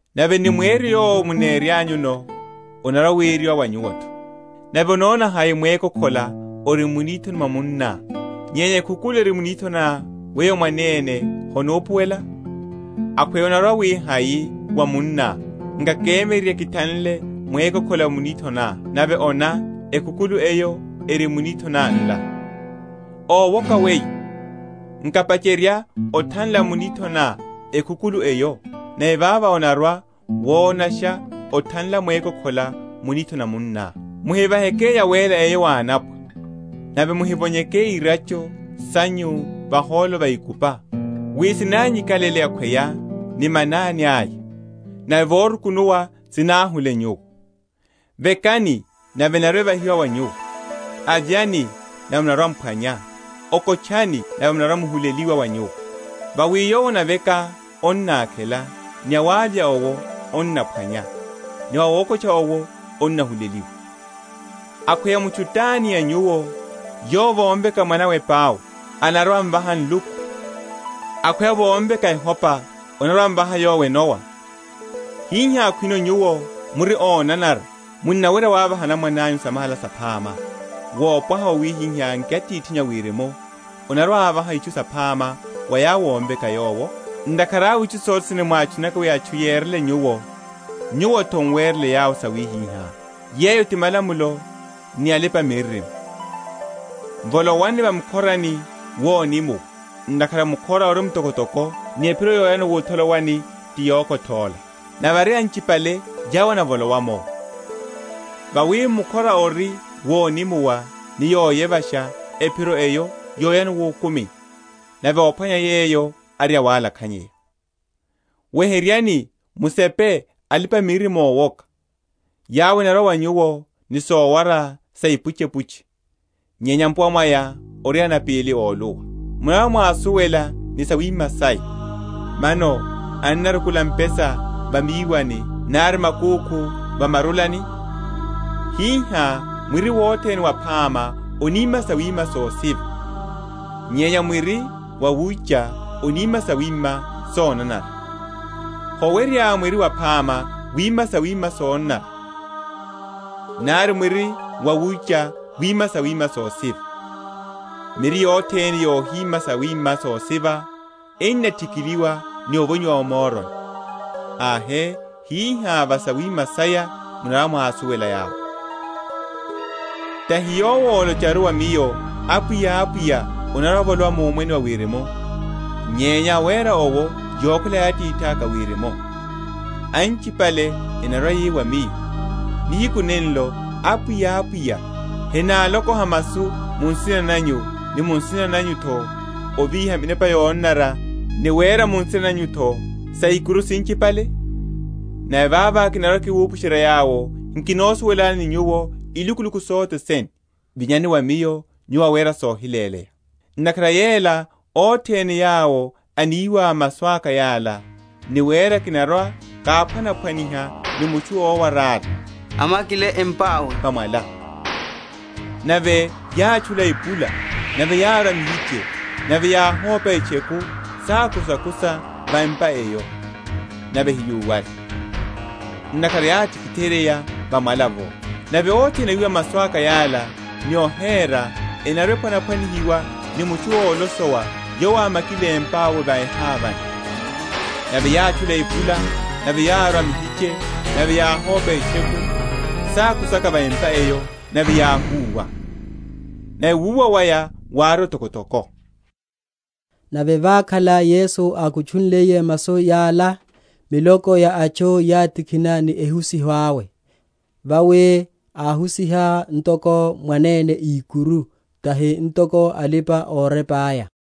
nave ni mweryo yowo muneryanyuno, onarwa‐weryiwa wa nyuwo’tho. Nave onona hai mwékokhola ori mu nithoni mwa munná, nyenya ekhukulu eri mu nithoni ná weyo mwanene honupuwela? Akhweya onarwa‐wi hai wa munná, Nkakemyererye kithanle mwékokhola mu nithoni ná; nave ona, ekhukulu eyo eri mu nithoni ná nla. Ówoka weyo! nkapacherya othanla mu nithoni ná ekhukulu eyo, nave vavo onarwa‐wonasha othanla mwékokhola mu nithoni na munná. Muhivaheke yawéla eyo wa anapwa, nave muhivonyeke irácho sanyu vahólo va ikupa, wi sinanyi?-?kalele akhweya ni manani aya, nave vorukunuwa sináhule nyuwo. Vekani, nave enarwa‐evahiwa wa nyuwo; avyani, nave munarwa‐m’phwanya; okotchani, nave n’narwa‐nihuleliwa wa nyuwo: Vawi yowo anaveka anakhela; ni awavya owo anaphwanya; ni wa awokotcha owo n’nahuleliwa. Akhweya mutchu tani a nyuwo, yowo vomveka mwanawe epau, anarwa‐amvaha nluku? Akhweya vomveka ehopa, anarwa‐amvaha yowo enowa? Hihá, khwino nyuwo, muri onanara, munnawerya ovaha anamwananyu samahala saphama, wopwaha wawihai nki Atithinyu a Wirimu anarwa‐avaha itchu saphama wa yawo ómveka Yowo? Ntakhara awe itchu sothene mwatchunaka wi atchu yerele nyuwo, nyuwo’tho muwerele yawo sawihiha. Yeyo ti malamulo ni alipa‐miririmo. Volowani va mukhorani wonimuwa: ntakhara mukhora ori mtokotoko, ni ephiro yoyano wutholowani ti yokothóla; nave ari anchipale yawo enavolowa’mo. Vawi mukhora ori wonimuwa, ni yoyevasha ephiro eyo yoyano wukumini, nave óphwanya yeyo ari awalakhanyeya. Weheryani musepe alipa‐miririmo ówoka, yawo enarwa wa nyuwo ni sowara sa ipuchepuche, nyenya mpuwa mwaya ari anapíli óluwa, munarwa‐mwásuwela ni sawima saya. Mano ennarukula mpesa va míwani, nari makúkhu va murulani? Hihá, mwiri wothene waphama onima sawima sosiva; nyenya mwiri wawucha onima sawima sonanara. Howerya mwiri waphama wima sawima sonanara, nari mwiri wawucha wima sawima sosiva. Miri yothene yohima yawima yosiva, enathikiliwa evonyiwa o moroni. Ahe, hihá va sawima saya munarwa‐mwásuwela yawo. Tahi yowo ólocharu wa Miyo, Apwiya, Apwiya, anarwa‐avolowa mu Omwene wa Wirimu; nyenya awera owo yokhwela ya Atithaka a Wirimu. Anchipale enarwa‐yi wa Miyo, nihiku nenlo, Apwiya, Apwiya, henálokoha masu mu nsina nanyu, ni mu nsina nanyu’tho ovíha minepa yonanara, ni wera mu nsina nanyu’tho saikuru sinchipale? Nave vavo kinarwa‐kiwupusherya yawo, Nkinosuwelani nyuwo ilukuluku sothene: vinyani wa Miyo, nyuwo awera sohiléleya. Ntakhara yela, othene yawo eniwa masu aka yala, ni wera, kinarwa‐káphwanaphwaniha ni mutchu owarála, ámakile empawe va mwala: Nave yátchula epula, nave yárwa mihiche, nave yáhopa etcheku, sákusaka va empa eyo; nave hayúwale: ntakhara yátikitheryeya va mwala’vo. Nave othene awiwa masu aka yala, ni ohera, enarwa‐ephwana?-?phwanihiwa ni mutchu olosowa yowo ámakile empawe va ehávani: Nave yátchula epula, nave yárwa mihiche, nave yáhopa etcheku, sákusaka va empa eyo; nave yáhúwa: nave wuwa waya wári otokotoko. Nave vákhala Yesu ákutchunliye masu yala, miloko ya atchu yátikhina ni ehusiho awe: vawi áhusiha ntoko mwanene ikuru, tahi ntoko alipa‐orepa’ya.